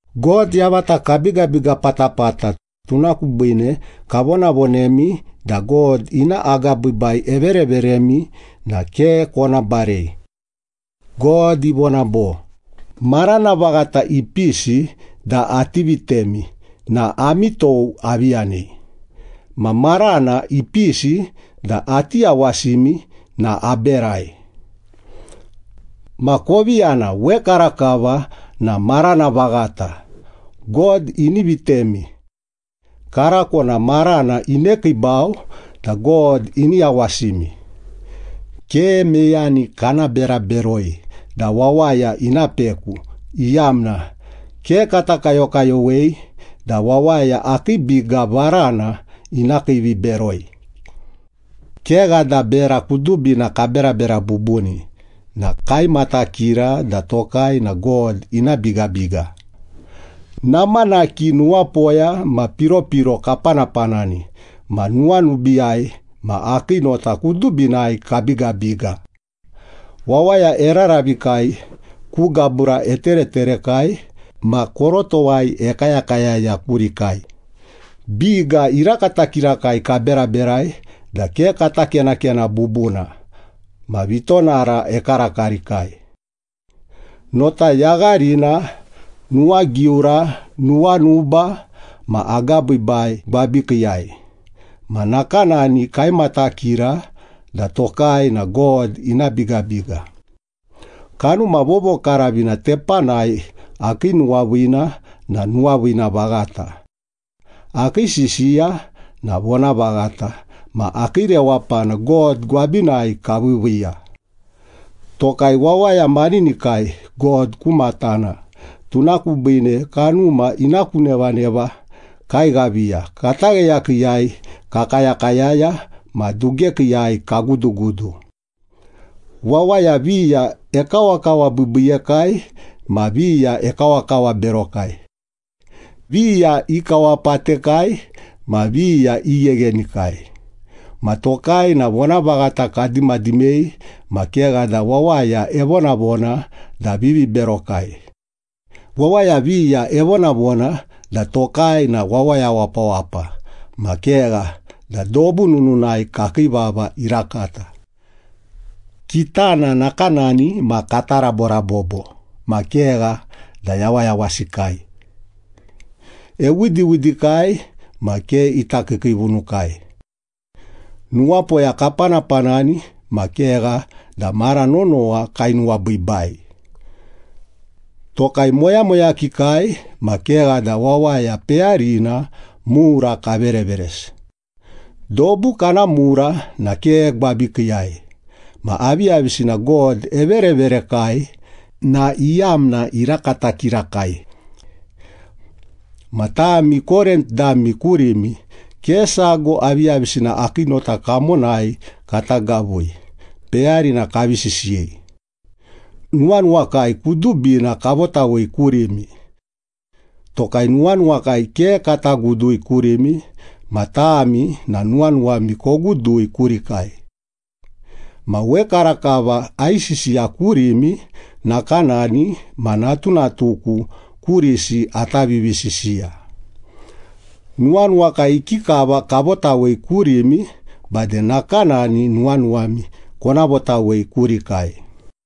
God yavata kabigabiga patapata, tuna kubiine kavonavonemi da God ina agabiibai evereveremi na ke kona barei. God ivona bo, “Marana vaghata ipisi da ati vitemi na ami tou avi yanei, ma marana ipisi da ati yawasimi na aberai.” Ma kovi yana, wekarakava na marana vaghata, God ini vitemi. Karako na marana inekiibau da God ini yawasimi. Ke meyani kana bera beroi da wawaya ina peku, iyamna ke kata kayokayowei da wawaya akii biga varana ina kiiviberoi. Kegha da bera kudubina kaberabera bubuni na kaimatakira da tokai na God ina bigabiga. Namanaki nuwapoya ma piropiro kapanapanani, ma nuwanubiiyai ma akii nota kudubinai kabigabiga. Wawaya eraravikai, ku gabura etereterekai, ma korotowai ekayakayaya kurikai. Biga irakata kirakai kaberaberai da ke kata kenakena bubuna ma vitonara ekarakarikai. Nota yagharina, nuwagiura, nuwanuba ma agabiibai gwabikiiyai, ma nakanani kaimatakira da tokai na God ina bigabiga. Kanuma Vovokaravina tepanai, akii nuwaviina na nuwaviina vaghata. Akii sisiya na vonavaghata, ma akii rewapana God gwabinai kaviiviiya. Tokai wawaya maninikai God ku matana, tuna kubiine kanuma ina ku nevaneva kaighaviya, katagheyakiiyai kakayakayaya ma dugekiiyai kagudugudu. Wawaya viya ekawakawabiibiiyekai ma viya ekawakawaberokai. Viya ikawapatekai ma viya igheghenikai. Ma tokai na vonavaghata kadimadimei ma kegha da wawaya evonavona da viviberokai. Wawaya viya evonavona da tokai na wawaya wapawapa ma kegha da dobu nununai kakii vava irakata. Kitana nakanani ma kata raborabobo ma kegha da yawayawasikai. Ewidiwidikai ma ke ita kiikiivunukai. Nuwapoya kapanapanani ma kegha da mara nonowa kainuwabiibai. Tokai moyamoyakikai ma kegha da wawaya peyarina mura kavereveresi. Dobu kana mura na ke gwabikiiyai ma aviyavisina God evereverekai na iyamna irakata kirakai. Ma tami Korint dami kurimi ke sago aviyavisina akii nota kamonai kata gavui, peyarina kavi sisiyei. Nuwanuwakai kudubina kavotawei kurimi. Tokai nuwanuwakai ke kata gudui kurimi, ma tami na nuwanuwami kogudui kurikai. Ma wekarakava aisisiya kurimi nakanani ma natunatuku kurisi ata vivisisiya. Nuwanuwakai ikikava kavotawei kurimi, bade nakanani nuwanuwami kona votawei kurikai.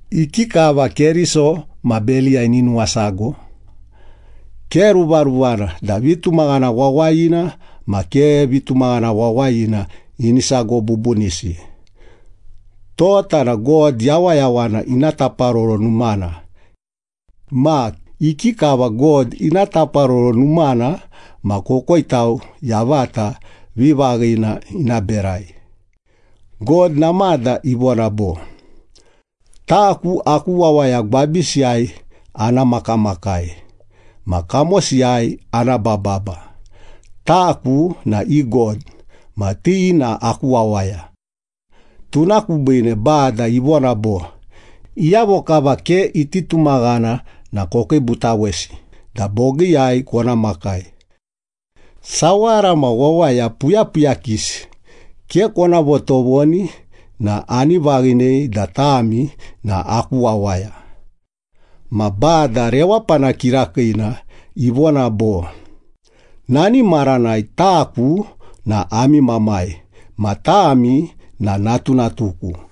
Ikikava Keriso ma Beliya ini nuwasago? Ke ruvaruvana da vitumaghana wawayina ma ke vitumaghana wawayina ini sago bubunisi. Tota na God Yawayawana ina taparoro numana. Ma ikikava God ina taparoro numana ma kokoitau yavata vivaghina ina berai? God namada ivona bo, “Taku aku wawaya gwabisiyai ana makamakai ma kamosiyai ana bababa. Taku na i God ma ti na aku wawaya.” Tuna kubiine Bada ivona bo, “Iyavo kava ke iti tumaghana na kokiibutawesi da bogiiyai kona makai. Sawara ma wawaya puyapuyakisi ke kona votovoni na ani vaghinei da tami na aku wawaya.” Ma Bada Rewapana Kirakiina ivona bo, “Nani maranai taku na ami Mamai ma tami na natunatuku.”